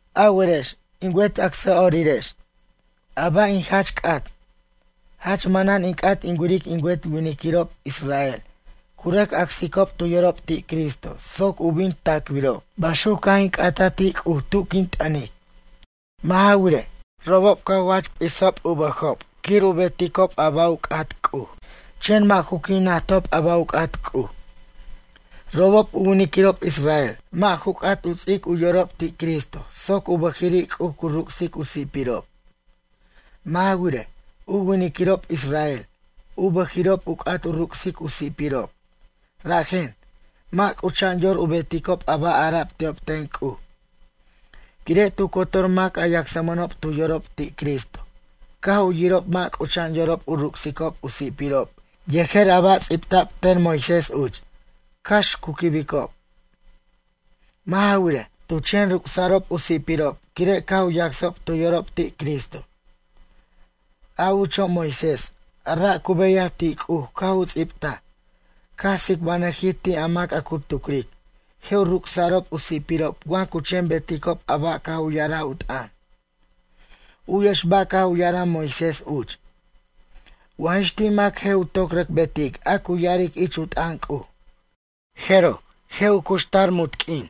A werex, in wet acsa'orirex, a ba' in jach c'at? Jach manan in c'at in wiric in wet winiquirob israel cu rʌc acsiquicob tu yorob ti' Cristo soc u bin tacbirob. Baxuc caj in c'ataj ti' C'uj tu quin t'ʌnic. Mʌ' ja wirej, robob cu jach p'isicob u bʌjob quir u beticob a ba' u c'at C'uj, chen mʌ' ju qui' najtob a ba' u c'at C'uj. Robob u winiquirob israel, mʌ' ju c'at u ts'ic u yorob ti' Cristo soc u bʌjiri' C'uj cu ruc'sic u si'pirob. Mʌ' ja wirej, u winiquirob israel, u bʌjiri'ob u c'at u ruc'sic u si'pirob, rajen, mʌ' c'ucha'an yor u beticob a ba' ara'b ti'ob ten C'uj. Quire' tu cotor mac a yacsmʌnob tu yorob ti' Cristo, caj u yirob mʌ' c'ucha'an yorob u ruc'sicob u si'pirob yejer a ba' ts'ibta'b ten Moisés uch, cax cu quibicob. Mʌ' ja wirej, tu chen ruc'sa'rob u si'pirob quire' caj u yacsob tu yorob ti' Cristo. A ucho' Moisés, a ra' cu beyaj ti' C'uj caj u ts'ibtaj, caj tsicbanʌjij ti' a mac a cu tucric, je' u ruc'sa'rob u si'pirob wa cu chen beticob a ba' caj u ya'araj u t'ʌn. U'yex ba' caj u ya'araj Moisés uch: “Wa jix ti' mac je' u toc rʌc betic a cu ya'aric ich u t'ʌn C'uj, jeroj je' u cuxtar munt q'uin.”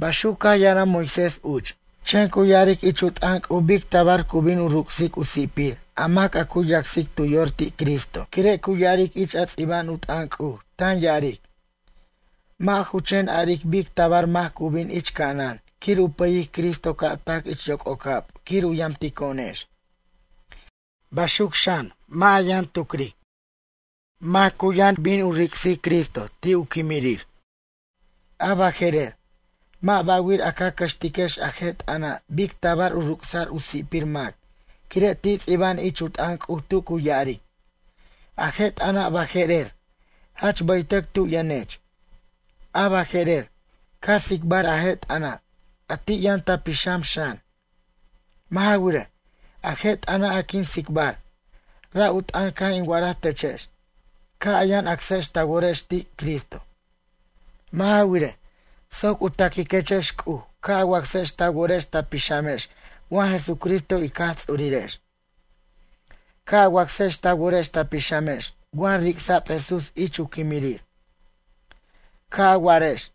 Baxuc caj ya'araj Moisés uch. Chen cu ya'aric ich u t'ʌn C'uj bic tabar cu bin u ruc'sic u si'pir a mac a cu yacsic tu yor ti' Cristo, quire' cu ya'aric ich a ts'iba'an u t'ʌn C'uj, tan ya'aric: “Mʌ' ju chen a'aric bic tabar mac cu bin ich ca'anan quir u pʌyic Cristo ca' tac ich yoc'ocab quir u yamtico'onex.” Baxuc xan, mʌ' ja yʌn tucric: “Mac cu yʌn bin u ric'sic Cristo ti' u quimirir?” A baje'rer, mʌ' ba'wir a ca cʌxtiquex a je' t'ʌna' bic tabar u ruc'sa'r u si'pir mac, quire' ti' ts'iba'an ich u t'ʌn C'uj tu cu ya'aric: “A je' t'ʌna' baje'rer, jach bʌytʌc tu yʌnech. A baje'rer, ca tsicbar a je' t'ʌna', a ti' yʌn ta pixam xan.” Mʌ' ja wirej, a je' t'ʌna' a quin tsicbar, ra' u t'ʌn caj in wa'araj techex, ca' a yʌn acsex ta worex ti' Cristo. Mʌ' ja wirej, soc u taquiquechex C'uj ca' a wacsex ta worex ta pixamex wa Jesucristo ic Jaj Ts'urirex. Ca' a wacsex ta worex ta pixamex wa ric'sa'b Jesús ich u quimirir. Ca' a wa'arex,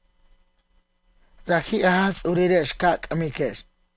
raji' a Jaj Tsurirex ca c'ʌmiquex.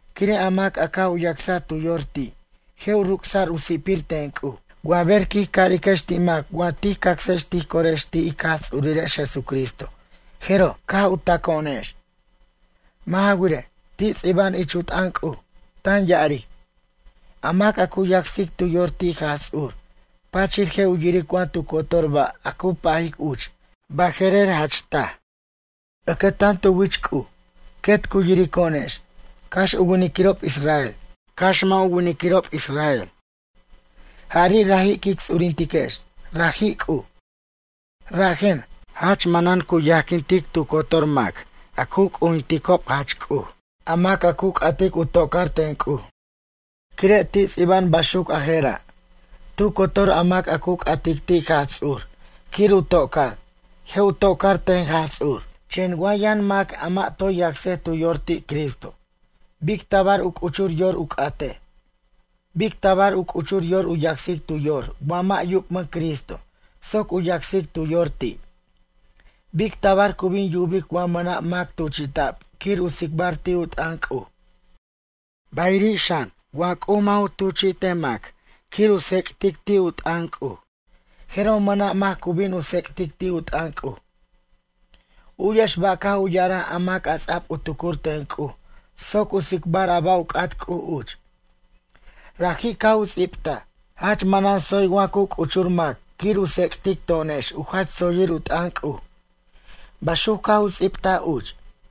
Quire' a mac a caj u yacsaj tu yor ti', je' u ruc'sa'r u si'pir ten C'uj. Wa ber quij cariquex ti' mac wa tij cacsex tij corex ti' ic Jaj Ts'urirex Jesucristo, jeroj, caj u taco'onex. Mʌ' ja wirej, ti' ts'iba'an ich u t'ʌn C'uj, tan ya'aric: “A mac a cu yacsic tu yor ti' Jaj Ts'ur, pachir je' u yiric wa tu cotor ba' a cu pajic uch, baje'rer jach taj.” Ʌcʌtan tu wich C'uj, quet cu yirico'onex, cax u winiquirob israel, cax mʌ' ju winiquirob israel. Jari' raji' quic ts'urintiquex, raji' C'uj. Rajen, jach manan cu yajquintic tu cotor mac a cu c'ujinticob jach C'uj, a mac a cu c'atic u toca'r ten C'uj. Quire' ti' ts'iba'an baxuc a jera': “Tu cotor a mac a cu c'atic ti' Jaj Ts'ur quir u toca'r, je' u toca'r ten Jaj Ts'ur.” Chen wa yʌn mac a mʌ' toy yacsej tu yor ti' Cristo. Bic tabar u c'uchur yor u c'atej? Bic tabar u c'uchur yor u yacsic tu yor wa mʌ' yubmʌn Cristo soc u yacsic tu yor ti'? Bic tabar cu bin yubic wa mʌna' mac tuchi'ta'b quir u tsicbar ti' u t'ʌn C'uj? Bayiri' xan wa C'uj mʌ' ju tuchi'tej mac quir u tsec'tic ti' u t'ʌn C'uj, jeroj mʌna' mac cu bin u tsec'tic ti' u t'ʌn C'uj. U'yex ba' caj u ya'araj a mac a ts'a'b u tucur ten C'uj soc u tsicbar a ba' u c'at C'uj uch. Raji' caj u ts'ibtaj: “Jach manan tsoy wa cu c'uchur mac quir u tsec'tic to'onex u jach tsoyir u t'ʌn C'uj.” Baxuc caj u ts'ibtaj uch.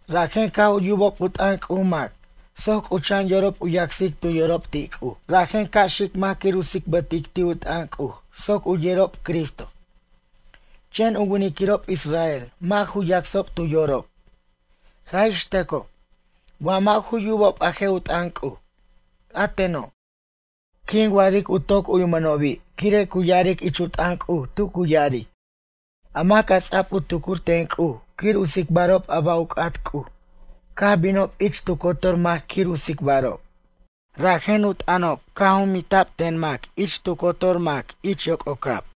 Rajen ca' u yubob u t'ʌn C'uj mac soc c'ucha'an yorob u yacsicob tu yorob ti' C'uj. Rajen ca' xic mac quir u tsicbʌtic ti' u t'ʌn C'uj soc u yerob Cristo. Chen u winiquirob israel mʌ' ju yacsob tu yorob. Jaj ix tʌcoj, wa mʌ' ju yubob a je' u t'ʌn C'uj. A teno', quin wa'aric u toc uwimʌnobi' quire' cu ya'aric ich u t'ʌn C'uj tu cu ya'aric: A mac a ts'a'b u tucur ten C'uj quir u tsicbarob a ba' u c'at C'uj caj binob ich tu cotor mac quir u tsicbarob. Rajen u t'ʌnob caj jumbinta'b ten mac ich tu cotor mac ich yoc'ocab.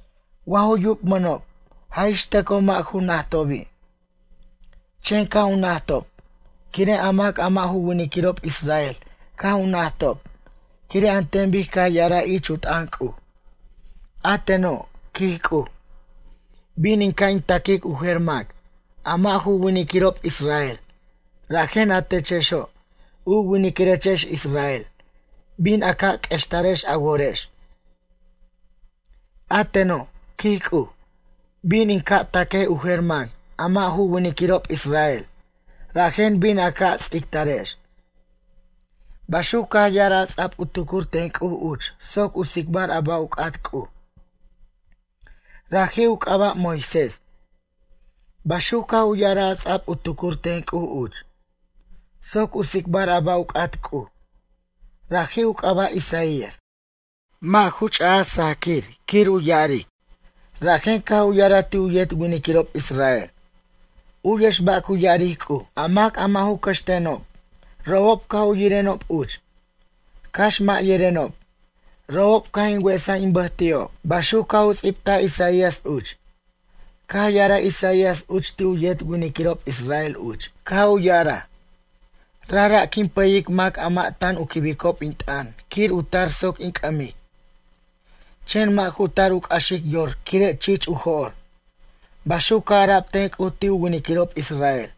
Wa ju yubmʌnob, jaj ix tʌcoj mʌ' ju najtobi'. Chen caj u najtob, quire' a mac a mʌ' ju winiquirob israel caj u najtob quire' an ten bic caj ya'araj ich u t'ʌn C'uj: A teno', quij C'uj, bin in ca' in taquic u jer mac, a mʌ' ju winiquirob israel, rajen a techexo', u winiquirechex israel, bin u ca' q'uextar a worex. A teno', quij C'uj, bin in ca' taquej u jer mac, a mʌ' ju winiquirob israel, rajen bin a ca' ts'ictarex. Baxuc caj ya'araj a ts'a'b u tucur ten C'uj uch soc u tsicbar a ba' u c'at C'uj. Raji' u c'aba' Moisés. Baxuc caj u ya'araj a ts'a'b u tucur ten C'uj uch, soc u tsicbar a ba' u c'at C'uj. Raji' u c'aba' Isaías. Mʌ' ju ch'aj sajquir quir u ya'aric, rajen caj u ya'araj ti' u yet winiquirob israel: U'yex ba' cu ya'aric C'uj. A mac a mʌ' ju cʌxtenob, robob caj u yirenob uch. Cax mʌ' yerenob, robob caj in wesaj in bʌj ti'ob. Baxuc caj u ts'ibtaj Isaías uch. Caj ya'araj Isaías uch ti' u yet winiquirob israel uch, caj u ya'araj: “Rajra' quin pʌyic mac a mʌ' tan u quibicob in t'ʌn quir u tar soc in c'ʌmic. Chen mʌ' ju tar u c'axic yor quire' chich u jo'r.” Baxuc caj ara'b ten C'uj ti' u winiquirob israel.